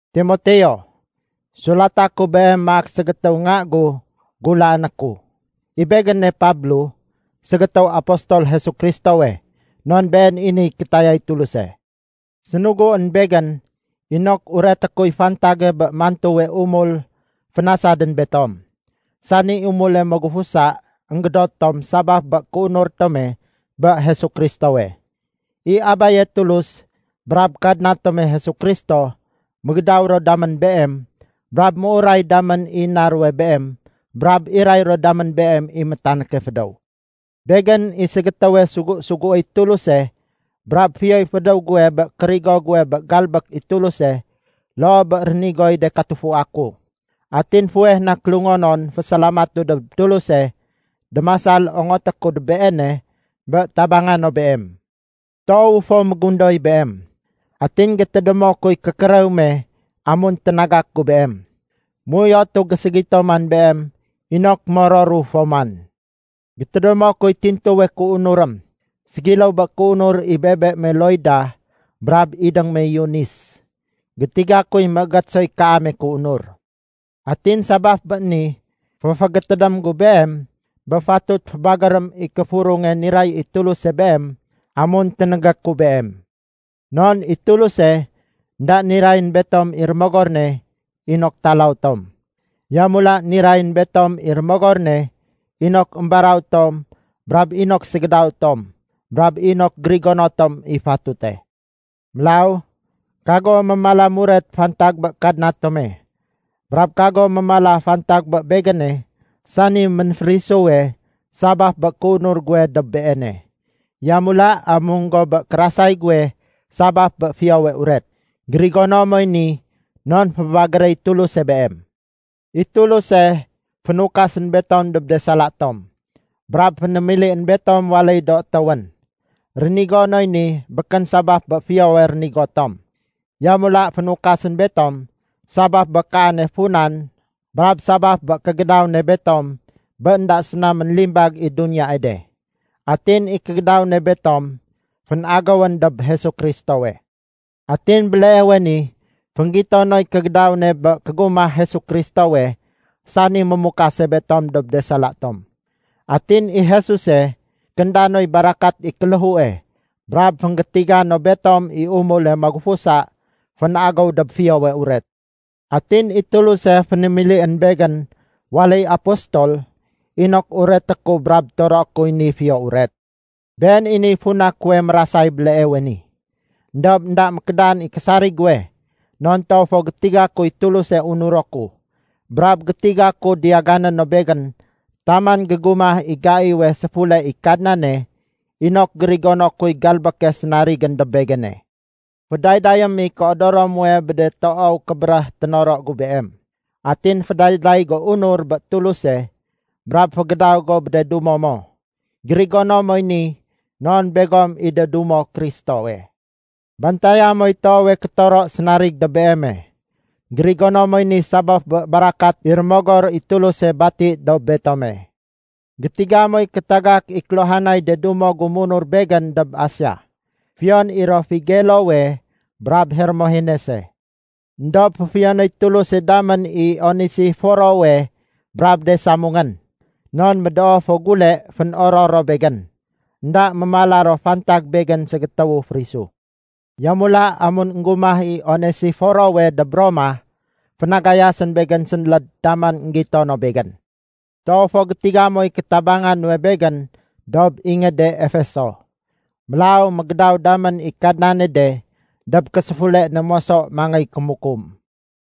Timoteo, Sulata ku beem maak ségétéw nga gu gulaané ku. I begéne Pablo ségétéw apostol Jesu Kristowe non been i niy kétayay Tuluse. Sénuguén begén inok ureté kuy fantage bé mantuwe umul fénasadén betom, sani umule magufusa énggédot tom sabaf bé kéunur tome bé Jesu Kristowe. I Abaye Tulus brab Kadna tome Jesu Kristo mégédaw ro damén beem brab méuray damén i na ruwe beem brab iray ro damén beem i métanéke fédéw. Begén i ségétéwe sugu-suguéy Tuluse brab fiyoy fédéw guwe bé kérigo guwe bé galbék i Tuluse loo bé rénigoy de katufua ku. Atin fuweh na kélungonon fésalamatu dob Tuluse démasal ongoté ku dob Beene bé tabanga no beem. Toowu fo mégundoy beem. Atin gétédémo kuy kékérew me amun ténagak gu beem. Méuyotu géségito man beem inok mororu fo man. Gétédémo kuy tintuwe kéunurém, ségiléw bé kéunur i bebe me Loida brab idéng me Eunis. Gétiga kuy méégét soy kaame kéunur. Atin sabaf bé ni, féfégétédém gu beem bé fatut fébagérém i kéfurunge niray i Tuluse beem amun ténégé ku beem. Non i Tuluse énda nirayén betom i Rémogor ne inok talaw tom. Yamula nirayén betom i Rémogor ne inok émbaraw tom brab inok ségédaw tom brab inok gérigono tom i fatute. Mélaw kago mémala muret fantag bé Kadna tome, brab kago mémala fantag bé begéne sani ménférisu sabaf bé kéunur guwe dob Beene. Yamula amung go bé kérasay guwe sabaf bé Fiyowe Uret. Gérigono moy ni non fébagéréy Tuluse beem. I Tuluse fénukasén betom dob de sala tom, brab fénémilién betom waléy do étéwén. Rénigo noy ni békén sabaf bé fiyowe rénigo tom. Yamula fénukasén betom sabaf bé kaane funan brab sabaf bé kégédaw ne betom bé énda séna ménlimbag i duniyae de. Atin i kégédaw ne betom fénagéwén dob Jesu Kristowe. Atin béleewe ni fénggito noy kégédaw ne bé kégumah Jesu Kristowe sani mémukase betom dob de sala tom. Atin i Jesuse kénda noy barakat i kéléhue brab fénggétiga no betom i umule magufusa fénagéw dob Fiyowe Uret. Atin i Tuluse fénémilién begén waléy apostol inok ureté ku brab toroé kuy ni Fiyo Uret. Been i niy funa kuwe mérasay béleewe ni. Endob énda mékédan i késarig guwe, non toow fo gétiga kuy Tuluse unuro ku brab gétiga ku diyagané no begén taman gégumah i gaiwe séfule i Kadnane inok gérigono kuy galbéke sénarigén dob begéne. Fédaydayém i kéodoro muwe bé de toow kébéréh ténoro gu beem. Atin fédayday go unur bé Tuluse brab fégédaw go bé de dumo mo. Gérigono moy ni non begom i de dumo Kristowe. Bantaya moy toowe kétoro sénarig dob beeme. Gérigono moy ni sabaf bé barakat i Rémogor i Tuluse bati dob betome. Gétiga moy kétagak i kéluhanay de dumo gu munur begén dob Asia, fiyon i ro Figelowe brab Hermogenese. Endob féfiyonéy Tuluse damén i Onesiforowe brab de samungén. Non médoo fo gule fénoror ro begén. Enda mémala ro fantag begén ségétéwu férisu. Yamula, amun énggumah i Onesiforowe dob Roma, fénagayasén begén sénléd taman énggito no begén. Toow fo gétiga moy kétabanga nuwe begén dob ingéde Efeso. Mélaw mégédaw damén i Kadnane de dob késéfule ne moso mangéy kémukum.